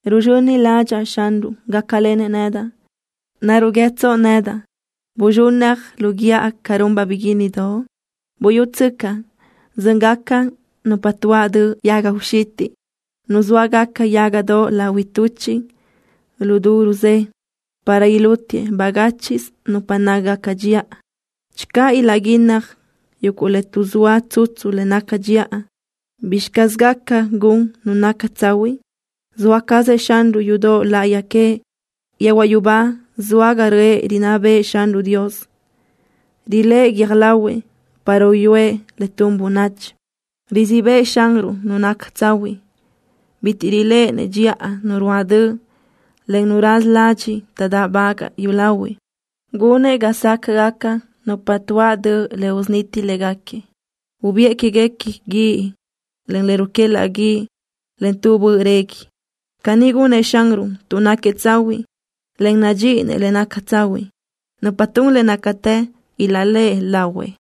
Ruzxöni ládxaʼa Xanruʼ gácalenëʼ nedaʼ. ¿Naruʼ guíëtsoʼ nedaʼ: “Buzxúnnaj lu guíʼa ca runbaʼ biguínnidoʼ”? Buyútsöcaʼ, zö́ngaca nupa tuáʼ döʼ yaga uxitiʼ. Nuzóagaca yágadoʼ lahui tuchiʼ lu du rusé, para ilútiëʼ bagáchiʼsö nupa nácagaca dxiʼa. Channö ilaʼguínnaj yuguʼ le tuʼzóa tsutsu le naca dxiʼa, ¿bizxi caz gaca gun nu naca tsahuiʼ? ¡Zoa cazëʼ Xanruʼ yudoʼ láʼayi queëʼ! Yehuaʼ yubá zoa ga röʼë rinná bëʼë Xanruʼ Dios. Riléʼe guiö́j lahuëʼ para uyúëʼ le tun bönachi. Rizíʼ bëʼë Xanruʼ nu naca tsahuiʼ. Bitiʼ riléʼenëʼ dxiʼa nu ruáʼ döʼ, en nu raza ladxiʼ taʼdáʼbagaʼ yúlahuiʼ. Gunëʼ ga sácaʼgaca nupa tuáʼ döʼ le usuniti léguequi. Ubiʼë quéguequi guíʼ, en le ruquélaʼ guíʼ, en tu böʼ régui. Caní gunëʼ Xanruʼ tuʼ náquiëʼ tsahuiʼ, en nadxíʼinëʼ le naca tsahuiʼ. Nupa tun le nácatë ilaʼléʼe lahuëʼ.